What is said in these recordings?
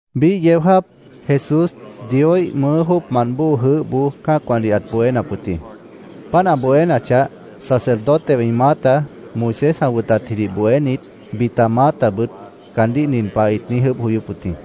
Biíh yeó jáap Jesús Dioíh mʉʉ́ jóocmant bóo jʉʉ́hboó cã́acwãdih ãt bohénap wʉt jĩ. Páant ã bohénachah, sacerdotewã ĩ maáta, Moisés ã wʉtatjidih bohénit, bita maátabʉt caandíh nin pah ĩt niíj ʉʉ́bh joyóp wʉt jĩ: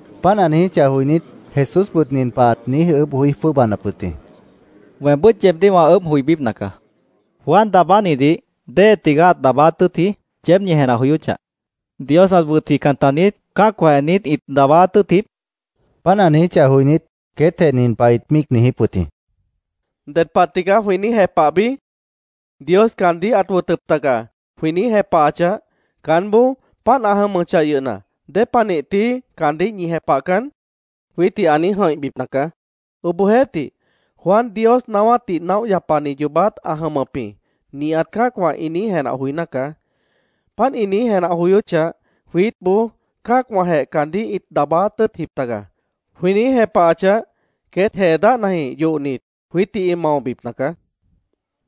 Páant ĩ niijíchah joinít, Jesúsbʉt nin pah ãt niíj ʉʉ́bh joí jwʉ́ʉbanap wʉt jĩ: —Weembʉ́t yeebdíh wã ʉʉ́bh joibípna caá. ¿Juan Daabánidih déhe tigaá ãt daabáát tʉ́ʉtji? yeéb ñi jenah joyóchah. ¿Dios ãt wʉtjican taniít? ¿Cã́acwãjeh niít ĩt daabáát tʉ́ʉtjip? Jesús queétdih ãt niijíp wʉt jĩ. Páant ã niijíchah joinít, queétjeh nin pah ĩt míic niijíp wʉt jĩ: “¿Ded pah tigaá jwĩ niíj jepah bií? ‘Dios caandíh ãt wʉtʉp taga’, jwĩ niíj jepahachah, caánboó ‘Páant ã jʉmʉchah yʉhna, ¿dépanih tií caandíh ñi jepahcan?’ jwiítdih ã niíj jʉ̃ihbipna caá. Obohjeéhtih, ‘Juan Dios naáwátdih naóh yapani yoobát ã jʉmʉp jĩ’, nihat cã́acwã ĩ niíj jenah joiná caá. Páant ĩ niíj jenah joyóchah, jwiítboó ‘Cã́acwãjeh caandíh ĩt daabáát tʉ́ʉtjip taga’, jwĩ niíj jepahachah, queét jee dáhnajĩh yohnit, jwiítdih ĩ maobipna caá”, ĩt niijíp wʉt jĩ.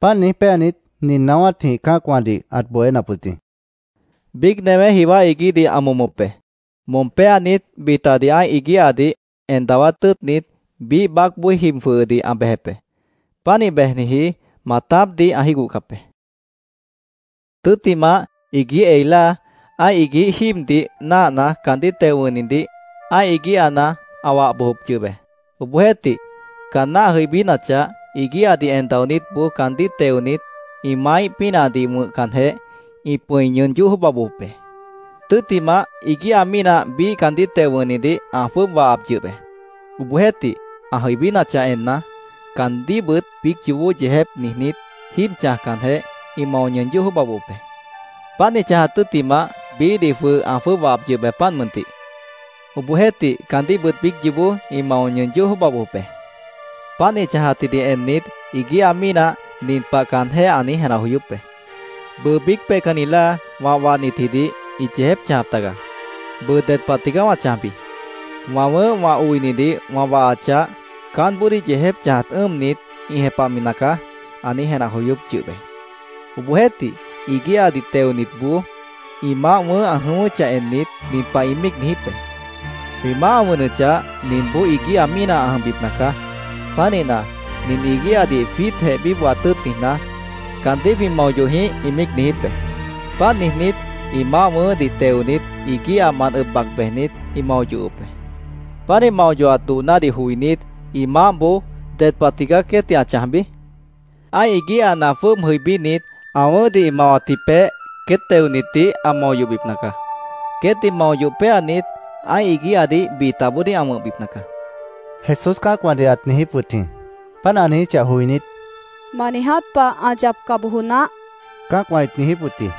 Páant niíj péanit, nin naáwátjĩh cã́acwãdih ãt bohénap wʉt jĩ: “Biíc newé jiwá iguíhdih ã momop be. Mom péanit, bitadih ã́ih iguíhadih en dawá tʉ́ʉtnit, biíh baácboó jib jwʉhʉdih ã bejep be. Pánih bejniji maatápdih ã jígohcap be. Tʉ́ttimah, iguíh ei láa, ã́ih iguíh jíibdih náahna, caandíh teo wʉ̃hnidih ã́ih iguíhana ã wah bojop yʉh be. Obohjeéhtih, caanná ã jʉibínachah, iguíhadih en daonítboó caandíh teonit, ĩ maáíh pínahdih wʉ̃hcanjeh, ĩ pʉ̃i ñʉʉn yóh jwʉ́ʉba bojop be. Tʉ́ttimah, iguíha mínah biíh caandíh teo wʉ̃hnidih ã jwʉ́ʉb wahap yʉh be. Obohjeéhtih, ã jʉibínachah enna, caandíhbʉt biíc yoobó yeejép niijnít, jíib wʉ̃hcanjeh, ĩ mao ñʉʉn yóh jwʉ́ʉba bojop be. Páant ĩ chãjat tʉ́ttimah, biíhdih jwʉh ã jwʉ́ʉb wahap yʉh be, páant mʉntih. Obohjeéhtih, caandíhbʉt biíc yoobó ĩ mao ñʉʉn yóh jwʉ́ʉba bojop be. “Páant ĩ chãjatjidih ennit, iguíha mínah nin pah caanjéh ã niíj jenah joyóp be, ‘Bʉʉ biíc peihcanni láa wã wahnitjidih ĩt yeejép chãjap tagaá. ¿Bʉʉ ded pah tigaá wã chãjbi? Wã wʉ̃ʉ́h wã oinidih wã wahachah, caánboodíh yeejép chãjat ʉ́ʉmnit, ĩ jepahmi nacaá’, ã niíj jenah joyóp yʉh be. Obohjeéhtih, iguíhadih teonitboó ĩ maáh wʉ̃ʉ́h ã jʉyʉ́chah ennit, nin pah ĩ míic niijíp be: ‘Jwĩ maáh ã wʉnʉchah, ninboó iguíha mínah ã jʉmbipna caá. Pánihna, nin iguíhadih jwiítjeh bíbohat tʉ́ʉt niijná, ¿caandíh jwĩ mao yoh jĩíh?’ ĩ míic niijíp be. Páant niijnít, ĩ maáh wʉ̃ʉ́hdih teonit, iguíhamant ʉb bac bejnit, ĩ mao yohop be. “Pánih mao yohat doonádih joinít, ĩ maáhboó ¿ded pah tigaá queétdih ã chãjbi? Ã́ih iguíhana jwʉ́ʉb jʉibínit, ã wʉ̃ʉ́hdih ĩ mawatji peéh queét teonitdih ã mao yohbipna caá. Queétdih mao yoh péanit, ã́ih iguíhadih bitaboodíh ã wʉ̃hbipna caá”, Jesús cã́acwãdih ãt niijíp wʉt jĩ. Páant ã niijíchah joinít, —¡Ma niiját pah ã yapca bojo naáh! cã́acwã ĩt niijíp wʉt jĩ.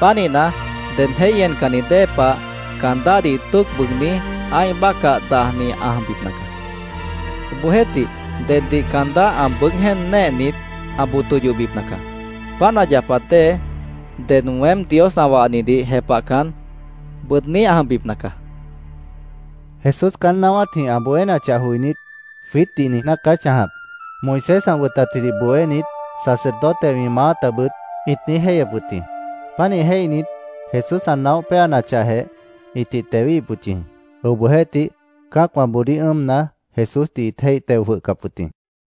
Pánihna, ded jéih encanni dée pah caan dáhdih tóoc bʉʉgní ã́ih bácah dajni ã jʉmbipna caá. Obohjeéhtih, deddih caan dáh ã bʉʉ́g jéen néehnit, ã boto yoh bojbipna caá. Páant ã yapat dée, ded weém Dios ã wahnidih jepahcan, bʉʉdní ã jʉmbipna caá”, Jesús queétdih ãt niijíp wʉt jĩ. Jesús caán naáwátjĩh ã bohénachah joinít, “Jwiítdih niijná caá ã chãjap”, Moisés ã wʉtatjidih bohénit, sacerdotewã ĩ maátabʉt ĩt niíj jéihyep wʉt jĩ. Pánih jéihnit, Jesús ã naóh péanachahjeh, ĩtih tewíhip wʉt yʉh jĩ. Obohjeéhtih, cã́acwãboodíh ʉ́ʉmna, Jesúsdih ĩt jéih teo jwʉhcap wʉt jĩ.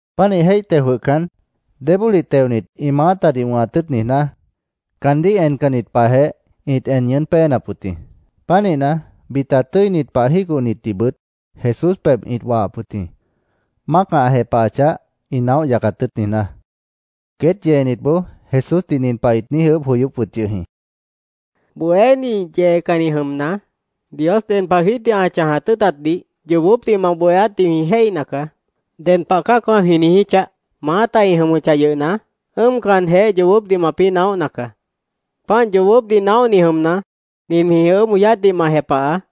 Pánih jéih teo jwʉhcan, débólih teonit, ĩ maátadih wʉ̃hat tʉ́ʉt niijná, caandíh encanni pahjeh, ĩt en ñʉʉ́n péenap wʉt jĩ. Pánihna, bita tʉ́init pah jígohnitdihbʉt Jesús pebh ĩt wahap wʉt jĩ, mácah ã jepahachah, ĩ naóh yacat tʉ́ʉt niijná. Queét yeenitboó Jesúsdih nin pah ĩt niíj ʉʉ́bh joyóp wʉt yʉh jĩ: —Bohéní, yeecanni jʉmna, Dios ded pah jwiítdih ã chãjat tʉ́ʉtatdih yoobópdih ma bohéátdih jwĩ jéihna caá. Ded pah cã́acwã jwĩ niijíchah, maáta ĩ jʉmʉchah yʉhna, ʉ́ʉmcanjeh yoobópdih mapĩ́ naóhna caá. Páant yoobópdih naóhni jʉmna, nin jwĩ ʉʉ́bh joyátdih ma jepahaá: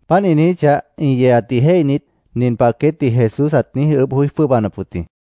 Páant ĩ niijíchah, ĩ yeeatdih jéihnit, nin pah queétdih Jesús ãt niíj ʉʉ́bh joí jwʉ́ʉbanap wʉt jĩ: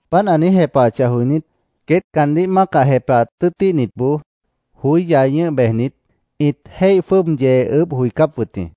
Páant ã niíj jepahachah joinít, queét caandíh mácah jepahat tʉ́ʉtíhnitboó joí yai ñʉ́h bejnit, ĩt jéih jwʉ́ʉb yee ʉʉ́bh joicáp wʉt jĩ.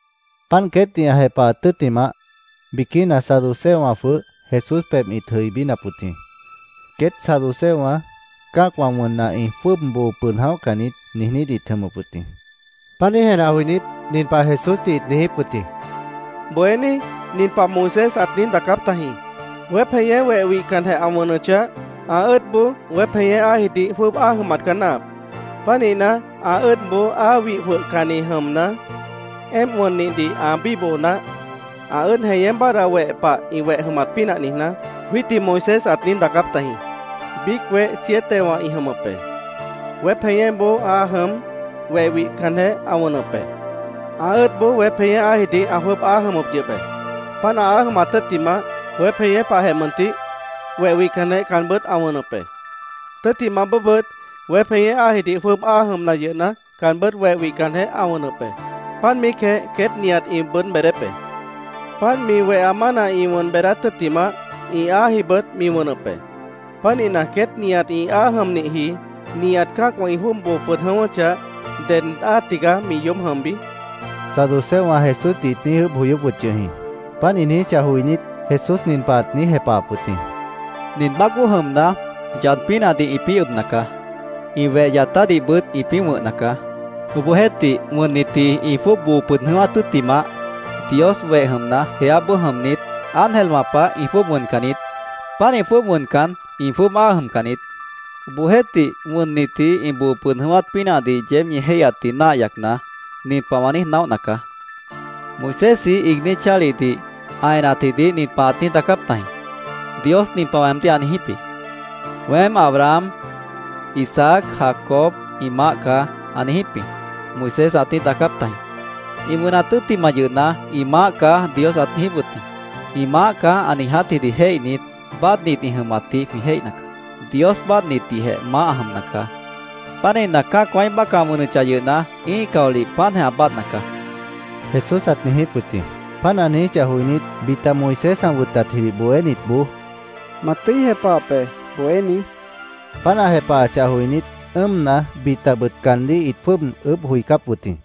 Páant queétdih ã jepahat tʉ́ttimah, biquína saduceowã jwʉh Jesús pebh ĩt jʉibínap wʉt jĩ. Queét saduceowã “Cã́acwã wʉnna, ĩ jwʉ́ʉb boo pʉd jʉ̃óhcan niít”, niijnít ĩt jʉmʉp wʉt jĩ. Pánih jenah joinít, nin pah Jesúsdih ĩt niijíp wʉt jĩ: —Bohéní, nin pah Moisés ãt niíj daacáp tajĩ: ‘Weép jeñé weh wihcanjeh ã wʉnʉchah, ã ʉ́ʉdboó weép jeñé áajidih jwʉ́ʉb áa jʉmat caá náahap. Pánihna, ã ʉ́ʉdboó áa wih jwʉhcanni jʉmna, éemp wʉnnihdih ã bíboho naáh, ã ʉ́ʉd jeñé báadhda weh pah ĩ weh jʉmat pínah niijná’, jwiítdih Moisés ãt niíj daacáp tajĩ. Biíc weh sietewã ĩ jʉmʉp be. Weép jeñéboó áa jʉm, weh wihcanjeh ã wʉnʉp be. Ã ʉ́ʉdboó weép jeñé áajidih ã jwʉ́ʉb áa jʉmʉp yʉh be. Páant áa jʉmat tʉ́ttimah, weép jeñé pahjeh mʉntih, weh wihcanjeh caanbʉ́t ã wʉnʉp be. Tʉ́ttimah bóobʉt weép jeñé áajidih jwʉ́ʉb áa jʉmna yʉhna, caanbʉ́t weh wihcanjeh ã wʉnʉp be. Páant míicjeh queét nihat ĩ bʉʉ́d beedép be. Páant mi weha mána ĩ wʉn beedát tʉ́ttimah, ĩ áajibʉt mi wʉnʉp be. Pánihna, queét nihat ĩ áa jʉmnihji, nihat cã́acwã ĩ jwʉ́ʉb boo pʉd jʉ̃ʉ́wʉ́chah, ¿ded áa tigaá mi yoób jʉmbi? saduceowã Jesúsdih ĩt niíj ʉʉ́bh joyóp wʉt yʉh jĩ. Páant ĩ niijíchah joinít, Jesús nin pah ãt niíj jepahap wʉt jĩ: —Nin baácboó jʉmna, yad pínahdih ĩpĩ́ ʉbna caá. Ĩ weh yatádihbʉt ĩpĩ́ wʉ̃hna caá. Obohjeéhtih, wʉnnitji ĩ jwʉ́ʉb boo pʉd jʉ̃ʉ́wát tʉ́ttimah, Dios weh jʉmna, jeáboó jʉmnit, ángelwã pah ĩ jwʉ́ʉb wʉncan niít. Pánih jwʉ́ʉb wʉncan, ĩ jwʉ́ʉb áa jʉmcan niít. Obohjeéhtih, wʉnnitji ĩ boo pʉd jʉ̃ʉ́wát pínahdih yeéb ñi jéihyatdih náah yacna, nin pah wã niíj naóhna caá: Moisésji iigní chálihdih ã enatjidih nin pah ãt niíj daacáp tajĩ: ‘Dios nin pah weemdíh ã niijíp jĩ: “Weém Abraham, Isaac, Jacob ĩ Maáh caá”, ã niijíp jĩ’, Moisés ãt niíj daacáp tajĩ. Ĩ wʉnat tʉ́ttimah yʉhna, ‘Ĩ Maáh caá’, Dios ãt niijíp wʉt jĩ. ‘Ĩ Maáh caá’, ã niijátjidih jéihnit, báadhnit ĩ jʉmatdih jwĩ jéihna caá. ¡Dios báadhnitdihjeh Maáh ã jʉmna caá! Pánihna, cã́acwãíh bácah ã wʉnʉchah yʉhna, ĩ́ih caolih páantjeh ã báadhna caá, Jesús ãt niijíp wʉt jĩ. Páant ã niijíchah joinít, bita Moisés ã wʉtatjidih bohénitboó, —Ma tʉ́i jepahap be, Bohéní, ĩt niijíp wʉt jĩ. Páant ã jepahachah joinít, ʉ́ʉmna, bitabʉt caandíh ĩt jwʉ́ʉb ʉʉ́bh joicáp wʉt jĩ.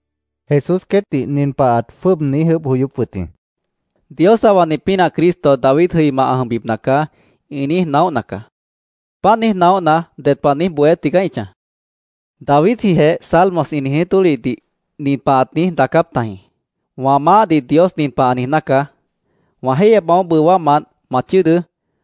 Jesús queétdih nin pah ãt jwʉ́ʉb niíj ʉʉ́bh joyóp wʉt jĩ: —‘Dios ã wahni pínah Cristo David jʉima ã jʉmbipna caá’, ĩ niíj naóhna caá. ¿Páant niíj naóhna, ded pah niíj bohé tigaá ĩ chãj? Davidjijeh Salmos ĩ niijní tólihdih nin pah ãt niíj daacáp tajĩ: ‘Wã Maáhdih Dios nin pah ã niijná caá: “Wã jéihyepmant bóo bʉwámant ma chʉ́ʉdʉ́.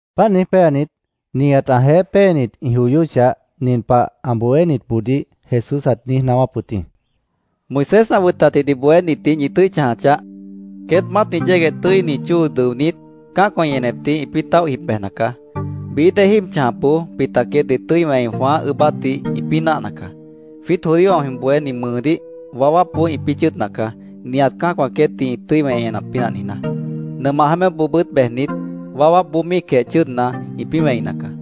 Páant niíj péanit, nihat ãjeéh péenit ĩ joyóchah, nin pah ã bohénitboodíh Jesús ãt niíj naáwáp wʉt jĩ: “¡Moisés ã wʉtatjidih bohénitdih ñi tʉ́i chãja chaáh! Queét maátni yégueh tʉ́ini chóo dʉonít, cã́acwã ĩ enepdih ĩpĩ́ táoh jib bejna caá. Bií dée jíib chãjapboó bita queétdih tʉ́i wẽi jwãáh ʉʉ́bátdih ĩpĩ́ náahna caá. Jwiít judíowã jwĩ bohéát mʉʉdíh waáwápboó ĩpĩ́ chʉ́ʉdna caá, nihat cã́acwã queétdih ĩ tʉ́i wẽi enat pínah niijná. Nʉmah jeémépboobʉ́t bejnit, waáwápboó míicjeh chʉ́ʉdna, ĩpĩ́ wẽina caá.